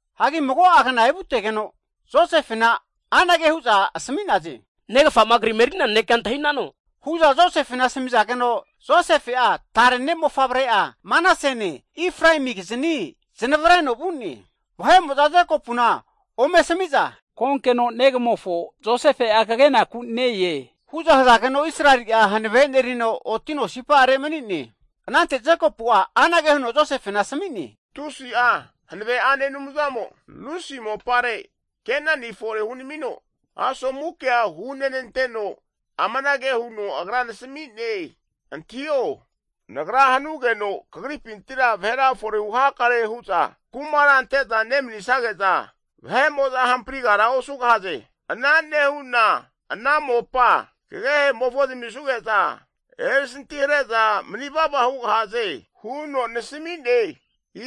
Hagi mago'a kna evutegeno Josefena anage hu'za asmi'naze, Negafa'ma kri eri'nea nanekea antahinano, hu'za Josefe asmi'zageno, Josefe'a tare ne'mofavre'a Manasene, Efraemikizni neznavreno vu'ne. Vahe'mo'za Jekopuna ome asami'za, konkeno negamofo Josefe'a kagenaku ne-e, hu'za hazageno Israeli'a hanave enerino otino sipa'are mani'ne. Anante Jekopu'a anage huno Josefena asmi'ne, Tusi'a Hanave'ane Anumzamo Lusi mopare Kenani fore hunamino asomu kea hunenanteno, amanage huno Agra nasmi'ne, Antahio, Nagra hanugeno kagripintira vahera fore hunakare hu'za kumara ante'za nemanisage'za, vahe'mo'za hamprigara osugahaze. Ana nehu'na ana mopa kagehe'mofo zamisuge'za, erisanti hare'za mani vava hugahaze huno nasami'ne.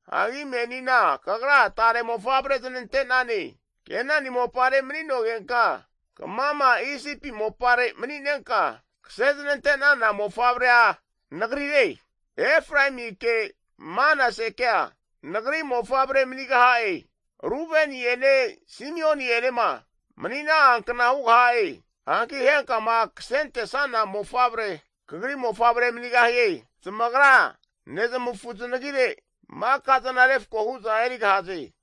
Hagi menina kagra tare mofavre znante'nane, Kenani mopare mani'nogenka, kamama Isipi mopare mani'nenka, kase znante'nana mofavrea nagrire, Efraemike Manasekea nagri mofavre manigaha'e. Rubeni'ene Simioni'enema mani'na'ankna hugaha'e. Hanki henkama kasentesana mofavrea kagri mofavre manigahie, zamagra nezmafu zanagire makazana refko hu'za erigahaze.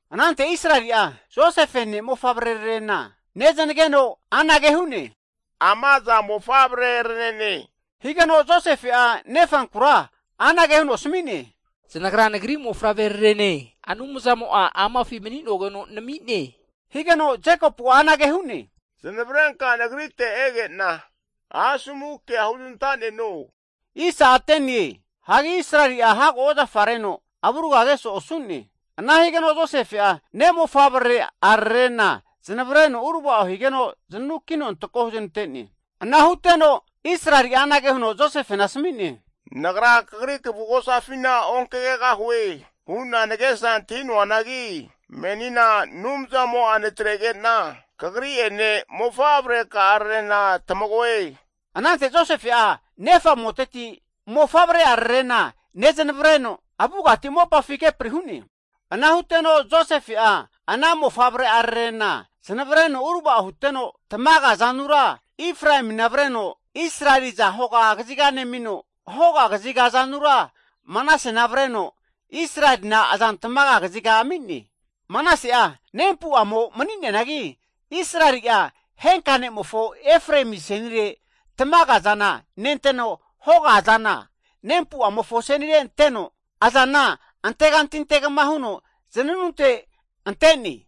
Anante Israeli'a Josefe ne'mofavrerarena neznageno anage hune, Ama aza mofavrerarene? Higeno Josefe'a nefankura anage huno asmi'ne, Zanagra nagri mofavre'rarene Anumzamo'a amafi mani'nogeno nami'ne. Higeno Jekopu'a anage hu'ne, Zanavrenka nagrite egena asomu kea huznantaneno. Hagi Israeli'a hago ozafareno avurga keso'e osu'ne. Ana higeno Josefe'a ne'mofavreararena zanavreno uravao higeno, zananukino antako huzanante'ne. Ana huteno Israeli'a anage huno Josefena asmi'ne, Nagra kagrira kvugosafina onkagegahue hu'na nagesa antahi'noanagi, menina Anumzamo'a natrege'na kagri'ene, mofavreka'ararena tamagoe. Anante Josefe'a nefa amoteti mofavre'a rarena neznavreno, avugati mopafi kepri hu'ne. Ana huteno Josefe'a ana mofavre'ararena zanavreno uravao huteno, tamaga azanura Efraemina avreno, Israelina aza hoga kaziga nemino, hoga kaziga azanura Manasena avreno Israelina azan tamaga kaziga ami'ne. Manase'a nempu'amo mani'neanagi, Israeli'a henka ne'mofo Efraemi asenire tamaga azana, nenteno hoga azana, nempu'amofo asenire anteno, azana anteganti antegma huno zananunte ante'ne.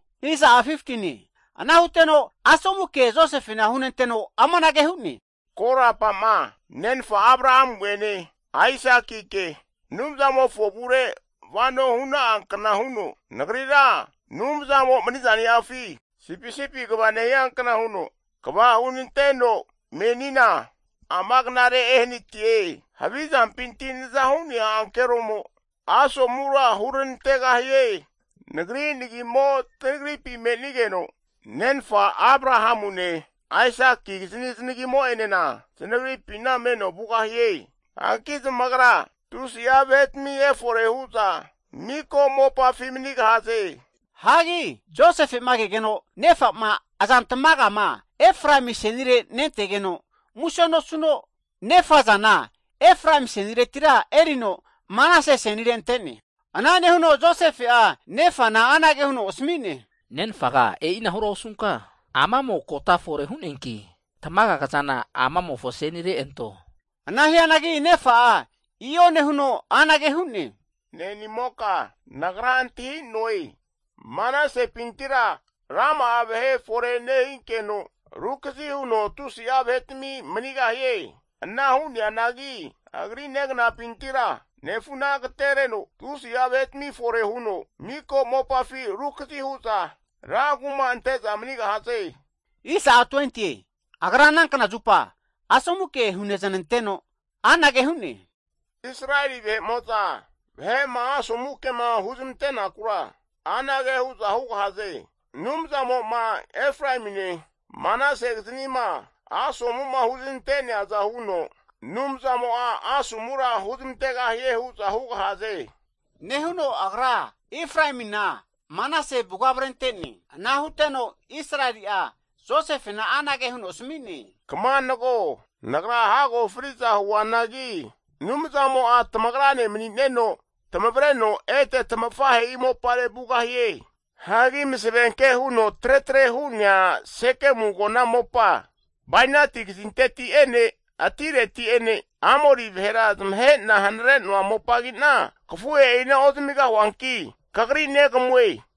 Ana huteno asomu ke Josefena hunenteno amanage hu'ne, korapa'ma nenfa Abrahamu'ene Aisakike Anumzamofo avure vano huna'a kna huno, nagrira Anumzamo mani'zaniafi sipisipi kva nehia kna huno kva hunanteno menina amagnare ehanatie. Havi zampinti naza hu'nea ankeromo, asomura huranantegahie. Nagri nagimo tanagripi me'nigeno, nenfa Abrahamune Aisakikizani zanagimo'enena zanagripina meno vugahie. Hanki zamagra tusi'a vahetami erifore hu'za miko mopafi manigahaze. Hagi Josefema kegeno nefa'ma azan tamagama Efraemi asenire nentegeno muse nosuno, nefa azana Efraemi aseniretira erino Manase asenire ante'ne. Ana nehuno Josefe'a nefana anage huno asmi'ne, Nenfaga e'inahura osunka, amamo kota fore hu'neanki tamaga kazana amamofo asenire anto. Ana hianagi nefa'a i'o nehuno anage hu'ne, Ne'nimoka nagra antahi'noe, Manasempintira rama'a vahe fore nehinkeno, rukazi huno tusi'a vahetami manigahie. Ana hu'neanagi Efraemipintira nefuna agatereno tusi'a vahetami fore huno, miko mopafina rukazi hu'za rankuma ante'za manigahaze. Agra ana kna zupa asomu ke huneznanteno anage hu'ne, Israeli vahe'mo'za vahe'ma asomu kema huzmante'nakura anage hu'za hugahaze. Anumzamo'ma Efraemine, Manasekiznima asomu'ma huzanante'neaza huno Anumzamo'a asomura huramantegahie hu'za hugahaze! Nehuno agra Efraemina, Manase avuga avrente'ne! Ana huteno Israeli'a Josefena anage huno asmi'ne, Kama nago! Nagra hago fri'za huanagi Anumzamo'a tamagrane mani'neno, tamavreno ete tamafahe'i mopare vugahie. Hagi masavenke huno tretre hu'nea Sekemu agona mopa bainati kazinknonteti'ene atireti'ene Amori vahera zamahe'na hanare'noa mopagi'na kafuhe'ina ozamigahuanki kagri negamue.